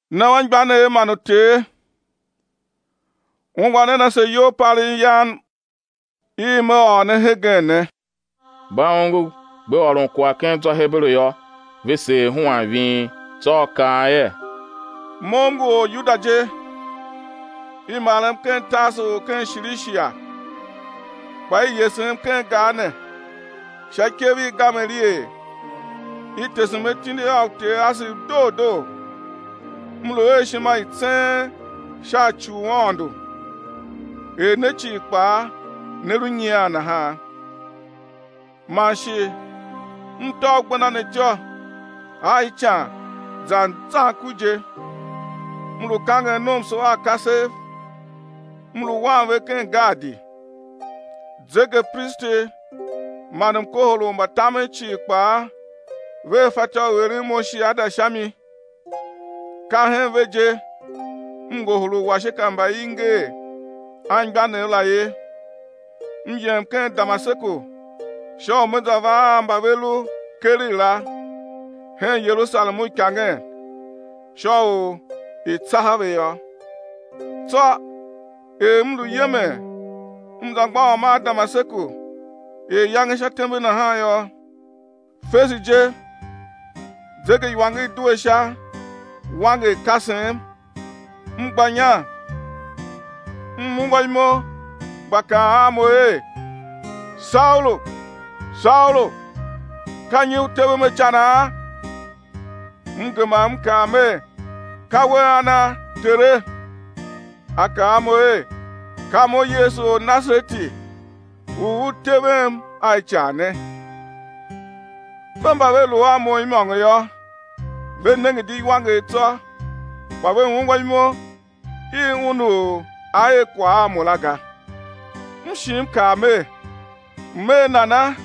Ne anmgbianev man uter, ungwa nen ase iyolpalegh yam i me ôr ne hegen ne! Mba ongo gbe ôron kwagh ken zwa u Heberu yô, ve seer huan ving. Tsô a kaa er: Mo m ngu Oryuda je, i marem ken Tarsu u ken Shilishia, kpa i yesem ken gar ne, sha ikev i Gamaliel, i tesem atindi a uter asev doo doo, m lu a ishima i tseen sha ci u Aôndo, er ne cii kpaa ne lu nyian nahan. Man shi m tôv gbenda ne ityô a ican zan zan ku je, m lu kangen nomso a kasev, m lu wan ve ken gaadi; zegepristi man mkohol u mbatamen cii kpaa vea fatyô u eren mo shiada sha mi; ka hen ve je m ngohol uwashika mba i nger anmgbianev la ye, m yem ken Damaseku sha u me za va a mba ve lu keregh la, hen Yerusalem uikangen, sha u i̱ tsaha ve yô. Tsô er m lu yemen, m za mgbôghom a Damaseku er iyange sha tembe nahan yô, fese je zegeiwanger due sha, wanger, kasem, m gba inya, m ungwa imo gba kaan a mo er: Saulu, Saulu, ka nyi u tevem a icanaa? M gema m kaa mer: Ka We ana, Tere? A kaa a mo er: Ka Mo, Yesu Ornasareti, u u tevem a ican ne. Ve mba ve lu a mo imôngo yô, ve nenge di iwanger tsô, kpa ve ungwa imo i Un u A er kwagh a mo la ga. M shi m kaa mer: M̱ er nana,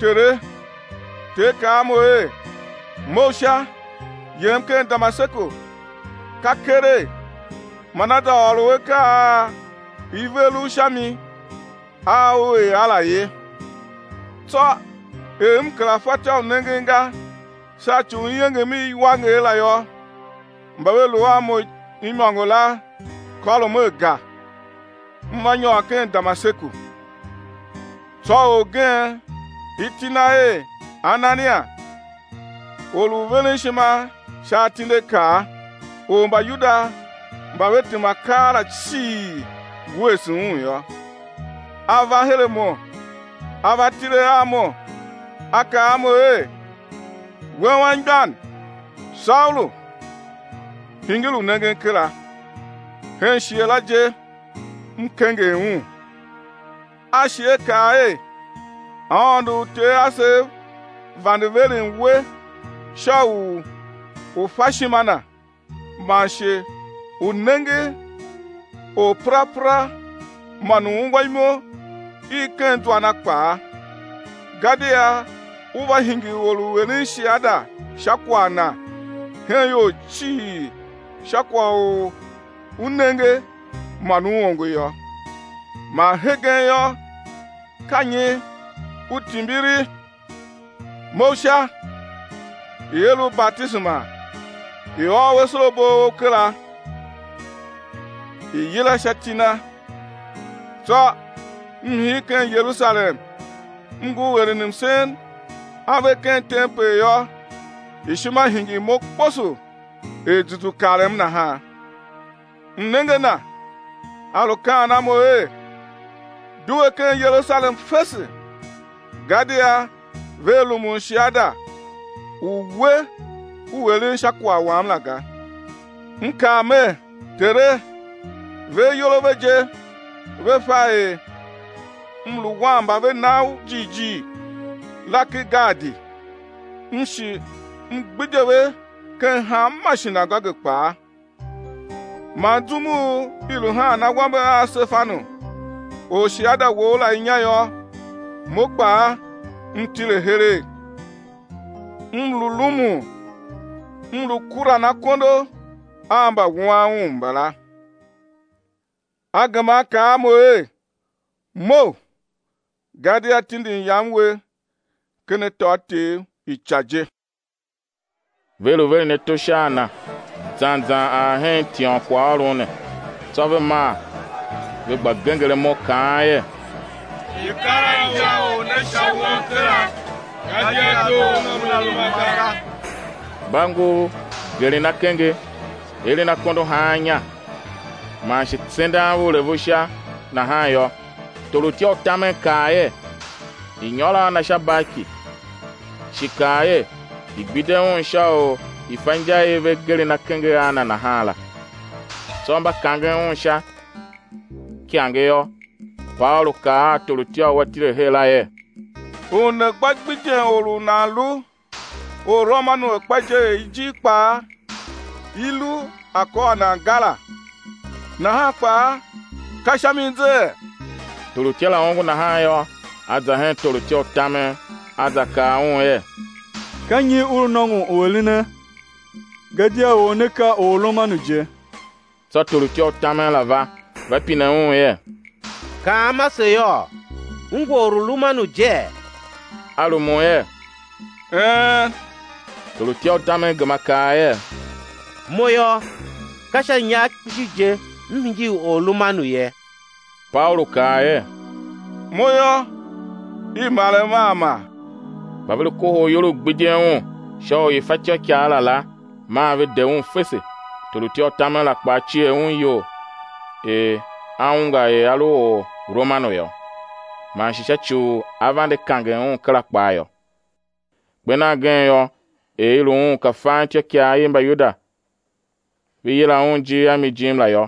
Tere? Ter kaa a mo er: Mough sha, yem ken Damaseku, ka keregh man á za ôr u akaa a i ver u sha mi a ú er a la ye. Tsô er m kera fatyô u nengen ga sha ci u iengem i iwanger la yô, mba ve lu a mo imôngo la kôrom aga, m va nyôr ken Damaseku. Tsô orgen, iti na er Anania, or u veren ishima sha atindiakaa, u Mbayuda mba ve tema keela cii wuese un yô, a va her a mo, a va tile a mo a kaa a mo er: We, anmgbian, Saulu, hingir u nengen kera! Hen shighe la je m kenger un. A shi a kaa er: Aôndo u uter asev vande veren we sha u u̱ fa ishima Na, man shi u̱ nenge Orperapera, man u̱ ungwa imo i ken zwa Na kpaa; gadia ú va hingir or u eren shiada sha kwagh Na hen ior cii sha kwagh u u nenge man u ongo yô. Man hegen yô, ka nyi u timbiri? Mough sha, i̱ er u batisema, i̱ ôô u asorabo a ou kera, i̱ yila sha iti Na. Tsô m hir ken Yerusalem, m ngur eren msen ave ken tempel yô, ishima hingir mo kposo er zuzu karem nahan, m nenge a Na, A lu kaan a mo er: Due ken Yerusalem fese, gadia vea rumun shiada u we u lu eren sha kwagh Wam la ga. M kaa mer: Tere, ve ayol a ve je ve fa er m lu wan mba ve na U jighjigh la ken gaadi, m shi m gbidye ve ken hanma shinagoge kpaa; man zum u i lu haan awambe a Sefanu, orshiada Wou la inya yô, mo kpaa m tile heregh, m lu rumun, m lu kuran akondo a mbawuan un mbala. A gema A kaa a Mo er: Mough, gadia tindin Yam we ken atôatyev ica je. Ve lu veren ato sha a na zan zan ar hen tiônkwaghôron ne tsô ve maa ve gba genger imo, kaan er: I̱ kar a injaor ne sha won kera gadia doo u una lu uma ga. Mba ngur geren akenge, eren akondo haan inya, man shi tsendan vuulevu sha nahan yô, torutya u tamen kaa er, i̱ nyôr a na sha barki, shi kaa er, i̱ gbidye un sha u i̱ fa inja i ve geren akenge a na nahan la. Tsô mba kangen un sha ikange yô, Paulu kaa a torutya u a tile her la er: U né gba gbidyen or u nan lu Orromanu akpa je er ijir kpaa i lu a kôr nan ga la, nahan kpaa ka sha mi zee? Torutya la ongo nahan yô, a za hen torutya u tamen, a za kaa un er: Ka nyi u lu nôngon u erene? Gadia or ne ka Orromanu je. Tsô torutya u tamen la va, va pine un er: Kaam ase yôô, u ngu Orromanu jee? A rumun er: Een. Torutya u tamen gema kaa er: Mo yô, ka sha inyar kpishi je, m hingir Orromanu ye. Paulu kaa er: Mo yô, i marem a mar. Mba ve lu kohol iyol u gbidyen un sha u i̱ fa ityôkwagh la la, maa ve de un fese. Torutya u tamen la kpaa cier un iyol er a ungwa er a lu Orromanu yô, man sha ci u a vande kangen un kera kpaa yô. Kper nan gen yô, er i lu un ka fan ityôikaa i Mbayuda ve yila un ijir a mi jim la yô,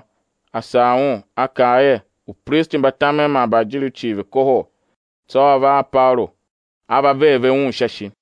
a sagh un, a kaa er upristi mba tamen man mbaajiriv cii ve̱ kohol; tsô a va a Paulu a ver ve un sha ishi.